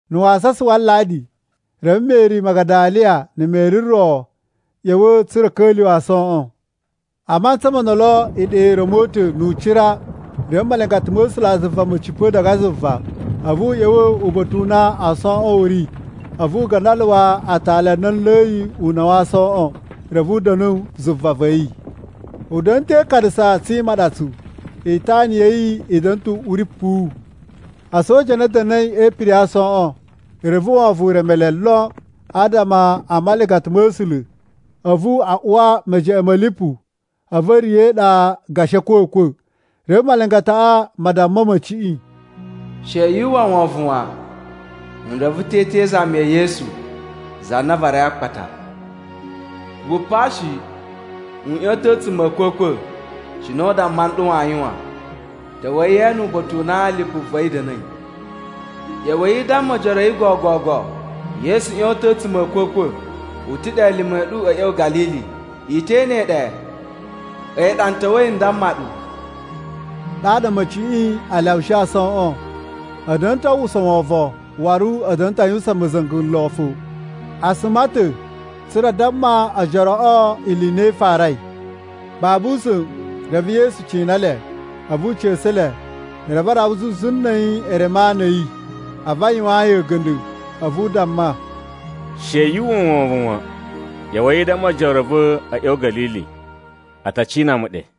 Na̱ wasasa wa Aladi, reve Meri Magadaliya na̱ Meri ro a̱ ꞌya̱wa̱ tsa̱ra̱ a̱ ka̱lyuwa̱ aasoꞌon. A mantsa mo ndolo, iɗa i ra̱mo ta̱ nu ucira. Reve malingata ma̱ A̱sulazuva ma̱ cipa̱ diga zuva, a̱vu u ꞌya̱wa̱ uba̱ta̱ u na aasoꞌon a̱ ri, a̱vu u gandaluwa aatali a na a ulayi una̱ wa aasoꞌon. Reve u da̱nu zuva va̱ yi. U da̱na̱ ta̱ e ikanasa tsi imaɗatsu, itana ya̱ yi i da̱na̱ ta̱ uꞌuri puwu. A̱soja a na a̱ da̱na̱i e ipiri ya aasoꞌon, reve wovon u reme le lon adama a malingata ma̱ A̱sula̱, a̱vu a uwa mejeꞌen ma̱ lipu, a̱vu a̱ riya̱ e iɗa gashi a̱kwa̱kwa̱. Reve malingataꞌa ma damma a̱ma̱ciꞌi, “She yu uwwa wovon wan. N reve ta̱ i te izami ya̱ Yesu, za na a varai a akpata. Wu pa shi. U ꞌyon ta̱ a̱tsuma̱ a̱ a̱kwa̱kwa̱ cine u damma nɗu waa yuwan. Ta̱wa̱i ye ene uba̱ta̱ u na lipu va̱ yi da̱na̱i. ꞌYa̱wa̱i i damma ojoro a̱ yi gogogo, ‘Yesu ꞌyon ta̱ a̱tsuma̱ a̱ a̱kwa̱kwa̱. U ta̱ ɗe elime a̱ ɗu a̱ ꞌya̱wa̱ Ga̱lili, i te ene yi ɗe.’ A̱yi ɗa n ta̱wa̱i n damma ɗu.” Ɗaɗa a̱ma̱ciꞌi a lyawushi aasoꞌon. A̱ da̱na̱ ta̱ a uwwusa wovon, waru a̱ da̱na̱ ta̱ a yuwusan ma̱za̱nga̱ lon fo. A suma ta̱ tsa̱ra̱ a damma ojoroꞌo ili i na i farai. Babu usa̱n reve Yesu cina le, a̱vu u ca̱sa̱ le. Reve a rawa zuzu na̱ a̱yi e reme ana a̱ yi, a̱vu a yuwaan yi a̱ga̱nda̱. A̱vu u damma, “She yu uwwa wovon wan! ꞌYa̱wa̱i i damma ojoro a̱ va̱ a̱ ꞌya̱wa̱ Ga̱lili. A ta cina mu ɗe.”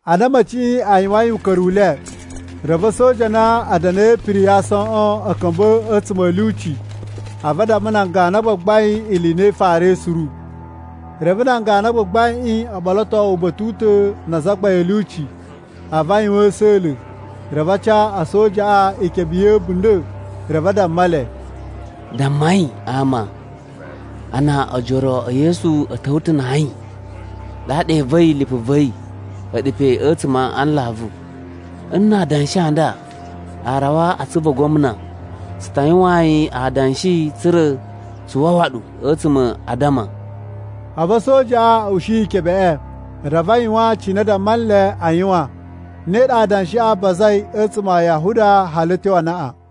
Ana a̱ma̱ciꞌi a̱ yuwain uka̱ru u le, reve a̱soja a na a̱ da̱na̱i e ipiri ya aasoꞌon a̱ ka̱mba̱ a̱tsuma̱ a̱ lyuci, a̱vu a damma nan ganu a gbagbain ili i na i farai suru. Reve nan ganu a gbagbaiꞌin o ɓoloto uba̱ta̱ u ta̱ na azagbain a̱ lyuci a̱vu a yuwan a̱sa̱la̱. Reve a ca a̱sojaꞌa ikebe ya̱ a̱bunda̱, reve a damma le, “Dammai ama a na ojoro e Yesu a̱ ta̱wa̱ ta̱ na ayin, ɗaɗa e iva̱i lipu va̱ yi a̱ɗu pe a̱tsuma̱ a nlavu. Nna adanshi a nda a rawa a atsuvu a gwamna, tsu ta yuwaan yi adanshi tsa̱ra̱ tsu wawa ɗu a̱tsuma̱ a addama.” A̱vu a̱sojaꞌa a̱ ushi ikebeꞌe, reve a yuwan cine a damma nle a yuwan. Ne ɗa adanshiꞌi a bazai a̱tsuma̱ a Yahuda hali a̱ tyo anaꞌan.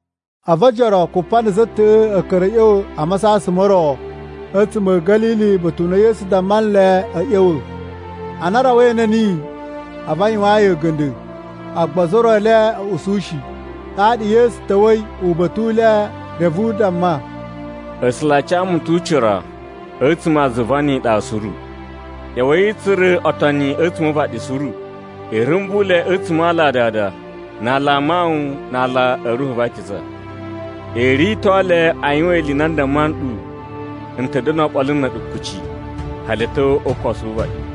A̱vu ojoro kupa na̱ za ta̱ꞌa̱ a̱ ka̱ra̱ a̱ ꞌya̱wa̱ a masasan mo ro a̱tsuma̱ a̱ Ga̱lili uba̱ta̱ u na Yesu damma nle a̱ ꞌya̱wa̱. Ana a rawa e ene niyi, a̱vu a yuwaan yi a̱ga̱nda̱, agba ozo o ro e le a̱ usu shi. Ɗaɗa Yesu ta̱wa̱i uba̱ta̱ u le reve u damma, “A̱sula̱ a ca mu ta̱ ucira a̱tsuma̱ a zuva ni iɗa suru. ꞌYa̱wa̱i i tsura̱ otoni a̱tsuma̱ o uvaɗi suru. I rumbu le a̱tsuma̱ a ala a Dada, na ala a Mawun na ala a̱ Ruhu va Akiza. I rito le a yuwan ili i na n damma nɗu. N ta̱ da̱na̱ oɓolo na̱ a̱ɗu kuci, hali a̱ tyo o ukosu wu uvaɗi.”